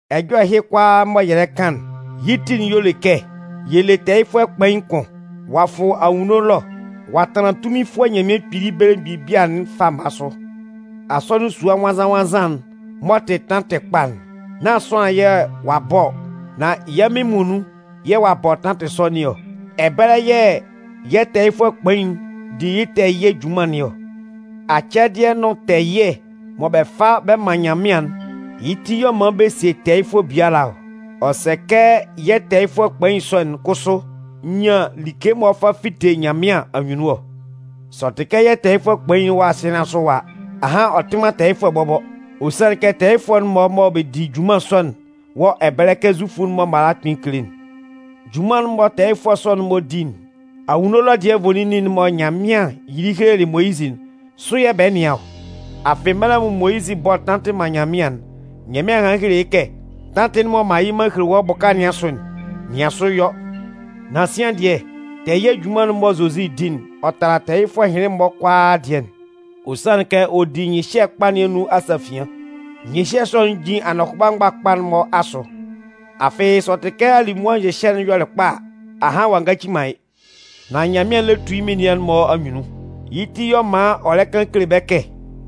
Ɛjɔlɛ ɛhɩ kʋalaa mɔ yɛ lɛ kan'n, yɩ́ ti'n y'ɔ le kɛ yɛ le tɛɛyɩfʋɛ kpain kʋn. Ɔ'a fʋ anwunno ɛlɔ ɔ'a tanlan tunminfʋɛ Nyanmɩan kpili belemgbin bia'n fama sʋ. Asɔnɩn sua nwannzan-nwannzan'n m'ɔ tɩ tantɩ kpa'n, nán sʋanlan yɛ̂ ɔ'a bɔ ɔ. Nan yɛ́ Mɩn muonun yɛ̂ ɔ'a bɔ tantɩ sɔ nɩn ɔ. Ɛbɛlɛ yɛ̂ yɛ́ tɛɛyɩfʋɛ kpain'n di yɩ́ tɛɛ ɛyɩɛ junman nɩn ɔ. Acɛdɩɛ nʋn tɛɛ ɛyɩɛ mɔ bɛ fa bɛ man Nyanmɩan'n, yɩ́ ti y'ɔ man bɛ sie tɛɛyɩfʋɛ biala ɔ. Ɔ sɛ kɛ yɛ́ tɛɛyɩfʋɛ kpain sɔ'n kʋsʋ nyan like mɔ ɔ 'fa fite Nyanmɩan anyunnun ɔ. Sɛ ɔ tɩ kɛ yɛ́ tɛɛyɩfʋɛ kpain'n wɔ asɩɛ nɩn asʋ ɛwa a, ahan ɔ tɩ man tɛɛyɩfʋɛ bɔbɔ. Ɔ sanlɩn kɛ tɛɛyɩfʋɛ'n-mɔ mɔ bɛ di junman sɔ'n wɔ ɛbɛlɛ kɛ Zufʋ'n-mɔ mala kpɩn kele'n. Junman'n mɔ tɛɛyɩfʋɛ sɔ'n-mɔ di'n, anwunno ɛlɔ dɩɛ'n nvoninnin'n mɔ Nyanmɩan yɩlɩ helelɩ Moyizɩ'n, sʋ yɛ̂ bɛ nɩan ɔ. Afɩ mɛlɛ mɔ Moyizɩ 'bɔ tantɩ'n man Nyanmɩan'n, Nyanmɩan hanlɩn helelɩ yɩ́ kɛ: Tantɩ'n mɔ m'an yɩ m'an hele wɔ́ bʋka nɩn asʋ'n, nɩan yɩ́ nwʋn sʋ yɔ. Nan sian dɩɛ, tɛɛ ɛyɩɛ junman'n mɔ Zozi di'n, ɔ tala tɛɛyɩfʋɛ ɛhɩnlɩn-mɔ kʋalaa dɩɛ'n. Ɔ sanlɩn kɛ ɔ di nyɩhyɛ kpa nɩn anun asafian. Nyɩhyɛ sɔ'n jin anɔhʋba mgbakpa'n-mɔ asʋ. Afɩ sɛ ɔ tɩ kɛ alimʋa nyɩhyɛ'n yɔlɩ kpa a, ahan ɔ'a ngaci man yɩ́. Nan Nyanmɩan lɛ tu yɩ́ menian'n-mɔ anyunnun. Yɩ́ ti, y'ɔ man ɔ lɛ kan kele bɛ́ kɛ: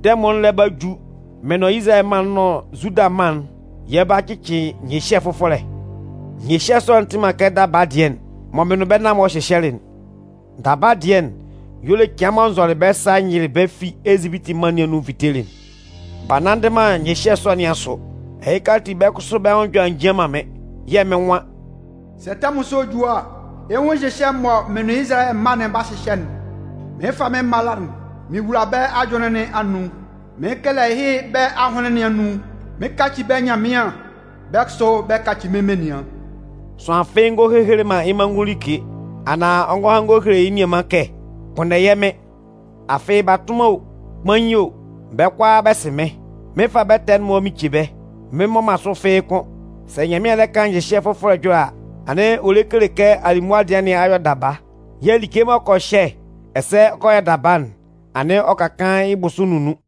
Tɛmʋn'n lɛ ba ju, mɩn nʋn Izalayɛ mân'n nʋn Zuda mân'n, yɛ 'ba cɩcɩ nyɩhyɛ fʋfɔlɛ. Nyɩhyɛ sɔ'n tɩ man kɛ daba dɩɛ'n mɔ mɩn nʋn bɛ́ nan-mɔ hyɩhyɛlɩ'n. Daba dɩɛ'n, y'ɔ le cɩan mɔ n zɔlɩ bɛ́ sa n yɩlɩ bɛ́ fi Ezipiti mân nɩn anun n vitelɩ'n. B'a nanndɩ man nyɩhyɛ sɔ nɩn asʋ. Ɛhɩka ati, bɛ́ kʋsʋ bɛ́ nwʋn ɛjɔlɛ a njian man mɩ́n. Yɛ́ Mɩn nwan: Sɛ tɛmʋn sɔ'n ju a, ɛ 'nwun nyɩhyɛ'n mɔ mɩn nʋn Izalayɛ mân'n 'ba hyɩhyɛ'n. Mɩn 'fa mɩ́n mala'n mɩn wula bɛ́ ajʋnlɩn nɩn anun. Mɩn 'kɛlɛ yɩ́ bɛ́ ahʋnlɩn nɩn anun. Mɩn 'kaci bɛ́ Nyanmɩan, bɛ́ kʋsʋ bɛ́ 'kaci mɩ́n menian. Sʋanlan fɩ́ɩ́ ngɔ hehele man yɩ́ manngʋn like, anaan ɔ ngɔ han ɔ ngɔ hele yɩ́ nianman kɛ: Kpʋnndɛ yɛ́ Mɩn. Afɩ batʋnman o, kpain o, bɛ́ kʋalaa bɛ sɩ mɩ́n. Mɩn 'fa bɛ́ ɛtɛ'n-mɔ mɩn ce bɛ́. Mɩn mmɔ man sʋ fɩ́ɩ́ kʋ́n. Sɛ Nyanmɩan lɛ kan nyɩhyɛ fʋfɔlɛ ɛjɔlɛ a, anɩn ɔ lɛ kele kɛ alimʋa dɩɛ nɩn a yɔ daba. Yɛ̂ like m'ɔ kɔ hyɛ, ɛsɛ ɔ kɔ yɔ daba'n, anɩn ɔ ka kaan yɩ́ bʋsʋ nunnun.